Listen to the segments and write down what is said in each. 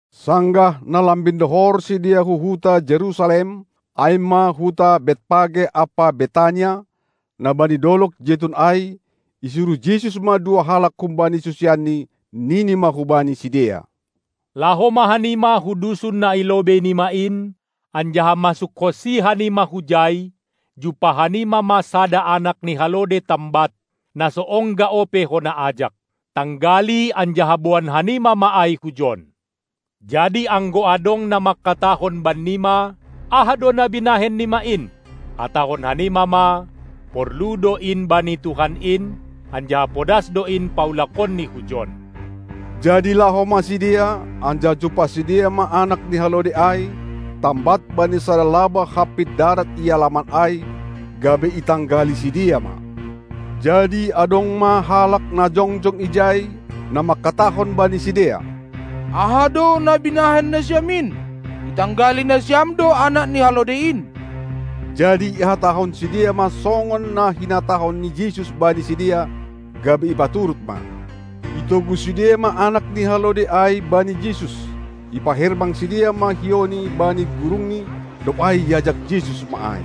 Sanggah na lambin dohor sidea hu huta Jerusalem, ai ma hu Betpage ampa Betania, na bani dolog Jetun ai, isuruh Jesus ma dua halak humbani susianNi, nini ma hubani sidea: Laho ma hanima hu dusun na i lobei nima in, anjaha masukhonsi hanima hujai, jumpah hanima ma sada anak ni halode tambat, na so ongga ope hona ajak. Tanggali anjaha boan hanima ma ai hujon! Jadi anggo adong na mangkatahon bannima: Aha do na binahen nima in! Hatahon hanima ma: Porlu do in bani Tuhan in, anjaha podas do in paulakonni hujon. Jadi laho ma sidea, anjaha jumpah sidea ma anak ni halode ai, tambat bani sada labah hampit darat i alaman ai, gabe itanggali sidea ma. Jadi adong ma halak na jongjong ijai, na mangkatahon bani sidea: Aha do na binahen nasiam in, itanggali nasiam do anak ni halode in! Jadi ihatahon sidea ma songon na hinatahon ni Jesus bani sidea, gabe ipaturut ma. Itogu sidea ma anak ni halode ai bani Jesus, ipaherbang sidea ma hiouni bani gurungni, dob ai iajak Jesus ma ai.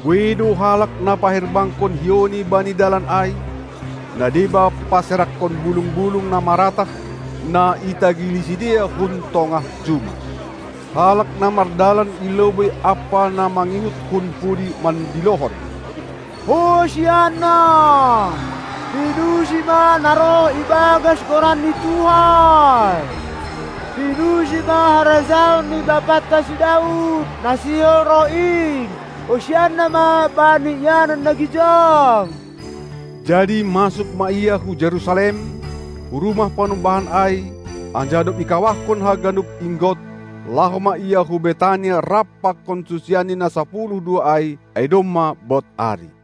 Buei do halak na paherbangkon hiouni bani dalan ai; na deba paserakkon bulung-bulung na maratah, na itagili sidea hun tongah juma. Halak na mardalan i lobei ampa na mangihut hun pudi mandilohon: Hosianna! Pinuji ma na roh ibagas goran ni Tuhan! Pinuji ma harajaon ni Bapanta si Daud na sihol roh in! Hosianna ma bani ianan na gijang! Jadi masuk ma Ia hu Jerusalem, hu rumah panumbahan ai, anjaha dob ikawahkon haganup inggot, laho ma Ia hu Betania rap pakon susianNi na sapuluh dua ai, ai domma bod ari.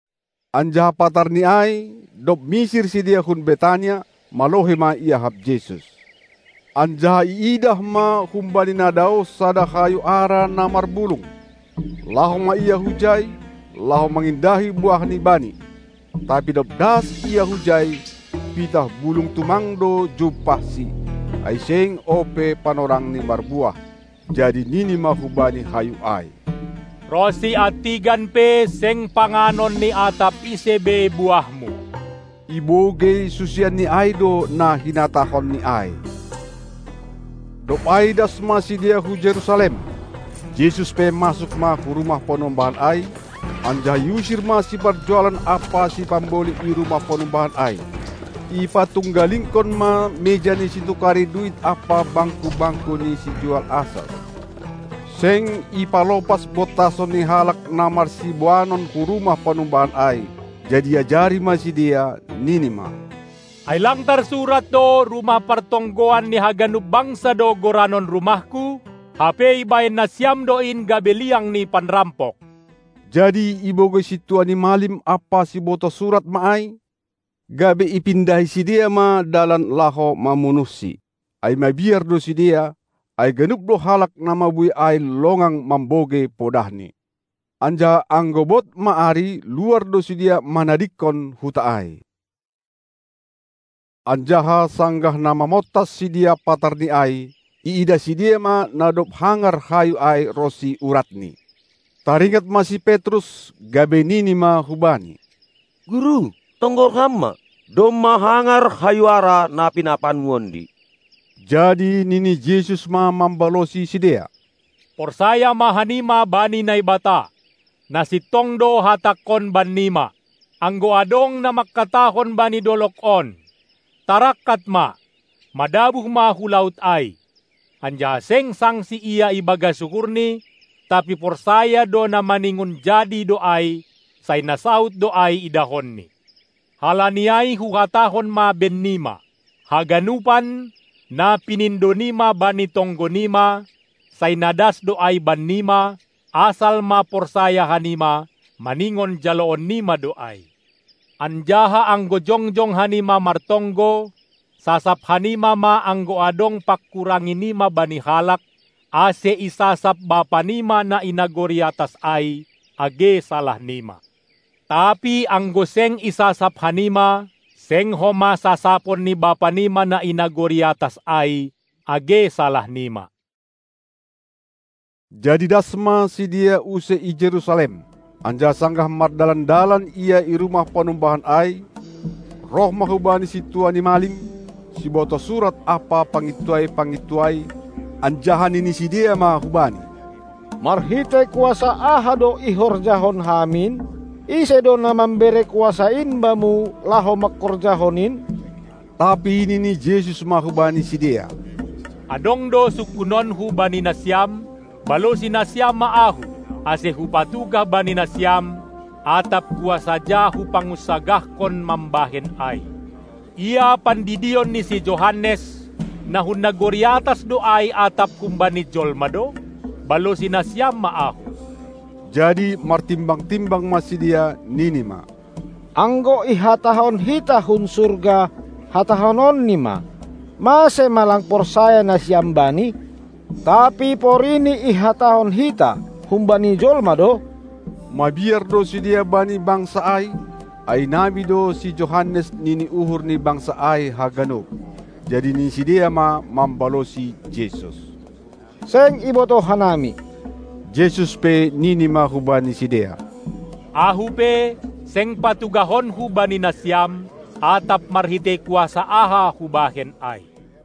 Anjaha patarni ai, dob misir sidea hun Betania, malohei ma iahap Jesus. Anjaha iidah ma humbani na daoh sada hayu ara na marbulung. Laho ma Ia hujai, laho mangindahi buahni Bani. Tapi dob das Ia hujai, pitah bulung tumang do jumpahSi, ai seng ope panorangni marbuah. Jadi nini ma hubani hayu ai: Ronsi antigan pe seng panganon ni atap ise be buahmu! Ibogei susianNi ai do nahinatahonNi ai. Dob ai das ma sidea hu Jerusalem. Jesus pe masuk ma hu rumah panumbahan ai, anjaha iusir ma siparjualan ampa sipamboli i rumah panumbahan ai. Ipantunggalingkon ma meja ni situkari duit ampa bangku-bangku ni sijual asas. Seng ipalopas bontason ni halak na marsiboanon hu rumah panumbahan ai. Jadi iajari ma sidea, Nini ma: Ai lang tarsurat do, rumah partonggoan ni haganup bangsa do goranon rumahKu? Hape ibahen nasiam do in gabe liang ni panrampok. Jadi ibogei sintua ni malim ampa sibotoh surat ma ai, gabe ipindahi sidea ma dalan laho mamunuhSi; ai mabiar do sidea, ai ganup do halak na mabuei ai longang mambogei podahNi. Anjaha anggo bod ma ari, luar do sidea manadingkon huta ai. Anjaha sanggah na mamontas sidea patarni ai, iidah sidea ma na dob hangar hayu ai ronsi uratni. Taringat ma si Petrus, gabe nini ma hu Bani: Guru, tonggor Ham ma! Domma hangar hayu ara na pinapaanmu ondi. Jadi nini Jesus ma mambalosi sidea: Porsaya ma hanima bani Naibata! Na sintong do Hatangkon bannima: Anggo adong na mangkatahon bani dolog on: Tarangkat ma, madabuh ma hu laut ai, anjaha seng sangsi ia i bagas uhurni, tapi porsaya do na maningon jadi do ai, sai na saud do ai idahonni. Halani ai Huhatahon ma bennima: haganupan, na pinindo nima bani tonggo nima, sai na das do ai bannima, asal ma porsaya hanima, maningon jaloon nima do ai. Anjaha anggo jongjong hanima martonggo, sasap hanima ma anggo adong pangkurangi nima bani halak, ase isasap Bapanima na i nagori atas ai age salah nima. Tapi anggo seng isasap hanima, seng homa sasapon ni Bapanima na i nagori atas ai age salah nima. Jadi das ma sidea use i Jerusalem. Anjaha sanggah mardalan-dalan Ia i rumah panumbahan ai, roh ma hu Bani sintua ni malim, sibotoh surat ampa pangintuai-pangintuai, anjaha nini sidea ma hu Bani: Marhitei kuasa aha do ihorjahon Ham in? Ise do na mambere kuasa in Bamu, laho mangkorjahon in? Tapi nini Jesus ma hubani sidea: Adong do sungkunonKu bani nasiam, balosi nasiam ma Ahu, ase Hupatugah bani nasiam, atap kuasa ja Hupangunsagahkon, mambahen ai. Ia pandidion ni si Johannes, na hun nagori atas do ai atap humbani jolma do? Balosi nasiam ma Ahu! Jadi martimbang-timbang ma sidea, nini ma: Anggo ihatahon hita hun surga, hatahononni ma: Mase ma lang porsaya nasiam bani? Tapi porini ihatahon hita: Humbani jolma do? Mabiar do sidea bani bangsa ai, ai nabi do si Johannes nini uhur ni bangsa ai haganup. Jadi nini sidea ma mambalosi Jesus: Seng ibotoh hanami! Jesus pe nini ma hubani sidea: Ahu pe, seng patugahonKu bani nasiam, atap marhitei kuasa aha hubahen ai.